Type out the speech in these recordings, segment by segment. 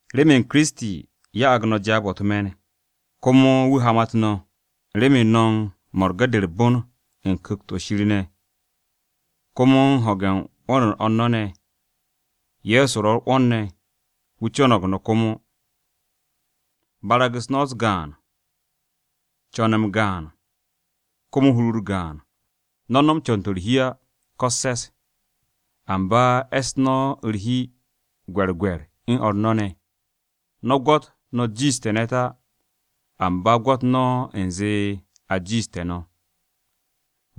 Remen Kiristi, ya'ag no̱ jaab-o̱ u̱t-me̱n, komo wu̱ hamat no̱, remen no̱ u̱n mo̱rge̱-de u̱r-bon u̱n Ku̱kt-o̱ Shir ne̱, komo u̱n ho̱ge̱ 'wo̱n-u̱r o̱r u̱n no̱ ne̱, Ye̱so ro̱ u̱r-'wo̱n ne̱, wu̱ co̱no̱g no̱ komo. Barag-u̱s no̱ u̱s-gaan, co̱n-m gaan, komo hur-u̱r gaan. No̱ no̱m co̱n-to̱ u̱r-hi á, ko u̱s-se̱s. Amba e̱ss no̱ u̱r-hi gwe̱rgwe̱r u̱n o̱r no̱ ne̱. No̱ gwo̱t no̱ jiishte̱ ne̱t á, amba gwo̱t no̱ u̱nze a jiishte̱ no̱.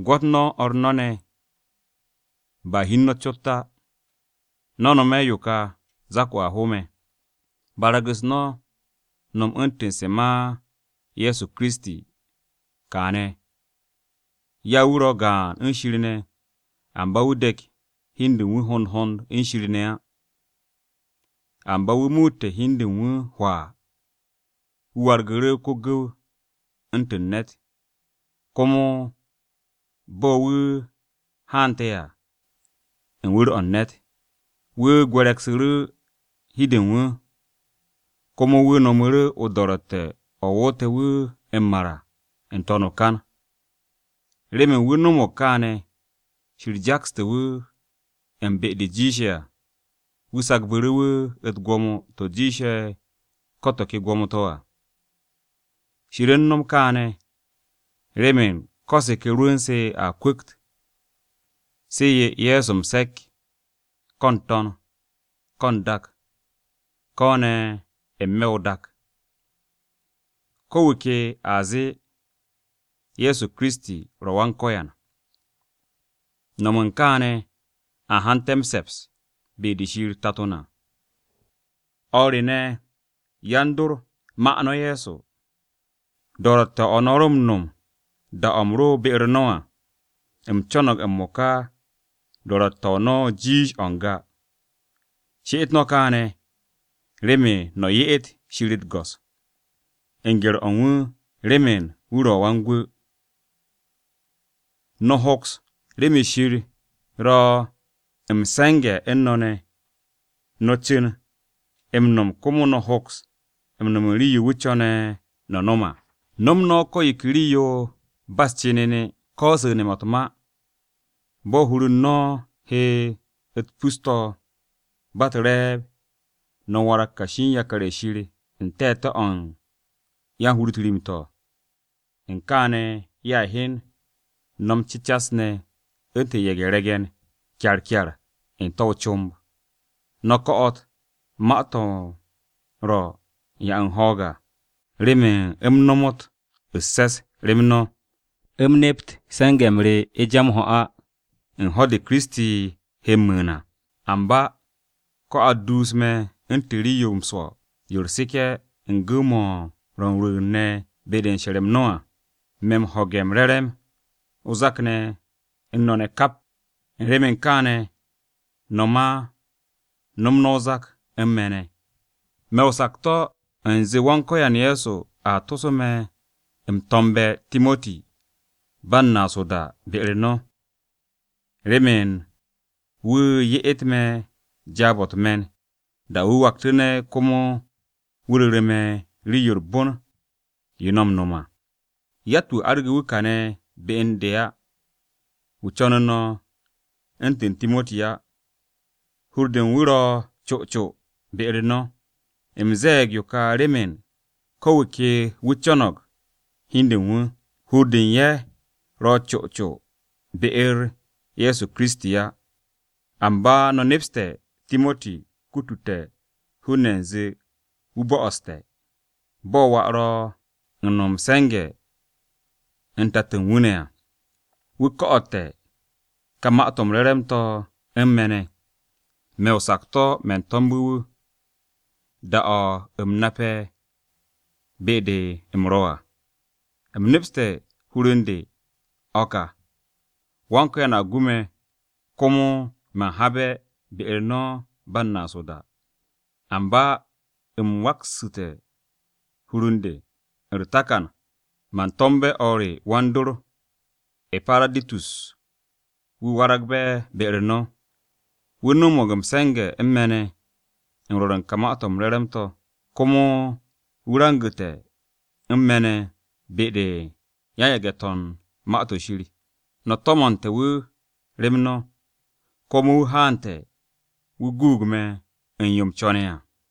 Gwo̱t no̱ o̱r no̱ ne̱, ba hi u̱n no̱ cot á. No̱ no̱me̱ yo ka, zak-o a ho me̱: Barag-u̱s no̱ nom u̱ntu̱n se̱ ma Ye̱so Kiristi, kaane̱: Ya wu̱ ro̱ gaan u̱n Shir ne̱, amba wu̱ de̱k hi u̱n de u̱n wu̱ hond hond u̱n Shir ne̱ á. Amba wu̱ muute̱ hi u̱n de u̱n wu̱ hwaa, wu̱ wargu̱ru̱ ko-gu̱w u̱ntu̱n ne̱t. Komo bo̱ wu̱ haante̱ à, u̱n wu̱r-o̱ u̱n ne̱t, wu̱ gwe̱re̱gsu̱ru̱ hi-de u̱n wu̱. Komo wu̱ no̱mu̱ru̱ o-do̱ro̱tte̱ o̱ woote̱ wu̱ m-mar à, n-to̱n o-kan. Remen wu̱ no̱mo̱g kaane̱, Shir jakste̱ wu̱ u̱n be-de jiishe̱ à, wu̱ sagbu̱ru̱ wu̱ u̱t-gwo̱mo to̱ jiishe̱ ko̱ to̱ ke gwo̱mo-to̱ à. Shir u̱n no̱m kaane̱, remen ko̱ se̱ ke rwu̱n-se a kwu̱kt, se̱ 'ye Ye̱so m-se̱k, ko̱ n-to̱n, ko̱ n-dak, ko̱ ne̱ n-me̱ o-dak. Ko̱ wu̱ ke ne̱ a zee, “Ye̱so Kiristi ro̱ Wan-Ko̱yan,” no̱m u̱n kaane̱, a hante̱ m-se̱ps be-de Shir Tato na. O̱r re ne̱, yan-dor, ma no̱ Ye̱so, do̱ro̱tte̱-o̱ no̱ ro̱ m-no̱m da-o̱ u̱m ro be-u̱r no̱ à. U̱m co̱no̱g m-mo̱ka do̱ro̱tte̱-o no̱ jiish o̱ n-ga. She'et no̱ kaane̱, remen no̱ ye'et Shir u̱t-go̱s, u̱n gye̱r-o̱ u̱n wu̱ remen wu̱ guug no̱. Remen Shir ro̱ u̱n se̱nge̱-m u̱n no̱ ne̱, no̱ cu̱n m-no̱m ne̱, komo no̱a hoks m-no̱m rii-yo wu̱ co̱ne̱ no̱ no̱m à. No̱m no̱ ko̱ yo ke rii-yo ba u̱s-cenene, ko su̱ne̱-mo̱ u̱t-ma. Bo̱ hur-u̱t no̱ he u̱t-pus to̱, ba u̱t-re̱e̱b, no̱ warag kashi u̱n yakar-ye̱ Shir n-te̱te̱ o̱ u̱n yan-hur-u̱t rim-to̱ u̱n kaane̱ ye̱a hyen no̱ m-cecas ne̱ u̱ntu̱n ye̱ge̱-re̱ge̱n kyarkyar n-te̱ o-comb. No̱ ko̱'o̱t ka ma-to̱ ro̱ u̱n 'ya m-ho̱o̱g à, remen u̱m nomot u̱s-se̱s rem no̱, u̱m nept se̱nge̱-m re ja m-ho̱ á, u̱n ho̱-de Kiristi, he m-mu̱u̱n à. Amba ko̱ a duus me̱ u̱ntu̱n rii-yo m-swo̱ yo u̱r-seke̱ u̱n gu̱w-mo̱ ro̱ m-rwu̱u̱n ne̱ be-de u̱n she̱r-m no̱ à, me̱ m-ho̱ge̱ m-re̱re̱m o-zak ne̱ u̱n no̱ kap. U̱n remen kaane̱ no̱ ma no̱m no̱ o-zak u̱n me̱ ne̱. Me̱ o-sakto̱ u̱nze Wan-Ko̱yan Ye̱so a toso me̱ m-to̱mbe̱ Timoti ba u̱n naas o-da be-u̱r no̱, remen wu̱ ye'et me̱ jaab-o̱ u̱t-me̱n, da-o̱ wu̱ waktu̱ne̱ komo wu̱ ru̱ru̱ me̱ rii-yo u̱r-bon yo no̱ m-no̱m à. Yatt-wu̱ arge̱ wu̱ kane̱ be u̱n de á, wu̱ co̱nu̱ no̱ u̱ntu̱n Timoti á. Hur-de u̱n wu̱ ro̱ co co be-u̱r no̱. U̱m ze̱e̱g yo ka remen ko̱ wu̱ ke wu̱ co̱no̱g hi u̱n de u̱n wu̱, hur-de u̱n ye̱ ro̱ co co be-u̱r Ye̱so Kiristi á. Amba no̱ nepste̱ Timoti kutute̱ hun-ne̱ u̱nze wu̱ bo̱'o̱ste̱. Bo̱ wà ro̱ u̱n no̱m m-se̱nge̱ u̱n tato u̱n wu̱ ne̱ à, wu̱ ko̱'o̱te̱ ka Ma-to̱ m-Re̱re̱m to̱ u̱n me̱ ne̱. Me̱ o-sakto̱, man to̱mbe̱ wu̱, da-o̱ u̱m nape̱ be-de u̱m ro̱ à. U̱m nepste̱ u̱n hur u̱n de, o̱ ka: Wan-Ko̱yan a gu me̱ komo man habe̱ be-u̱r no̱ ba u̱n naas o-da. Amba u̱m waksu̱te̱ hur u̱n de, u̱r-takan, man to̱mbe̱ o̱r re wan-dor, E̱paraditus, wu̱ waragbe̱ be-u̱r no̱. Wu̱ no̱mo̱g m-se̱nge̱ u̱n me̱ ne̱, u̱n rwo̱r u̱n ka Ma-to̱ m-Re̱re̱m to̱. Komo wu̱ rangu̱te̱ u̱n me̱ ne̱ be-de yan-yage̱-to̱ u̱n Ma-to̱ Shir. No̱ to̱mo̱nte̱ wu̱ rem no̱, komo wu̱ haante̱, wu̱ guug me̱ u̱n yo u̱m co̱ne̱ à.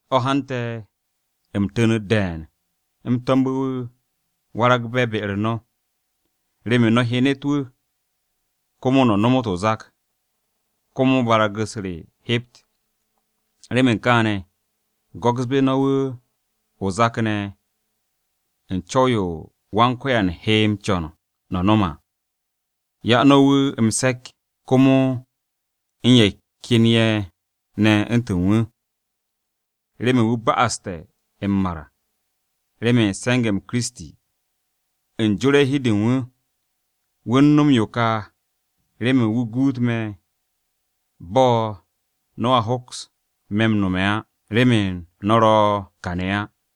O̱ hante̱ u̱m tu̱nu̱t de̱e̱n u̱m to̱mbe̱ wu̱ waragbe̱ be-u̱r no̱, remen no̱ hyenet wu̱, komo no̱ nomot o-zak, komo barag-u̱s re hept. Remen kaane̱, go̱ksbe̱ no̱ wu̱ o-zak ne̱ u̱n co̱w-yo Wan-Ko̱yan he m-co̱n no̱ no̱m à. 'Ya no̱ wu̱ m-se̱k komo u̱n ye̱ ken ye̱ ne̱ u̱ntu̱n wu̱, remen wu̱ ba'aste̱ m-mar remen se̱nge̱-m Kiristi, u̱n jo̱re̱ u̱n hi-de u̱n wu̱. Wu̱ u̱n no̱m yo ka remen wu̱ guut me̱ bo̱ no̱a hoks me̱ m-no̱me̱ á, remen no̱ ro̱ kane̱ á.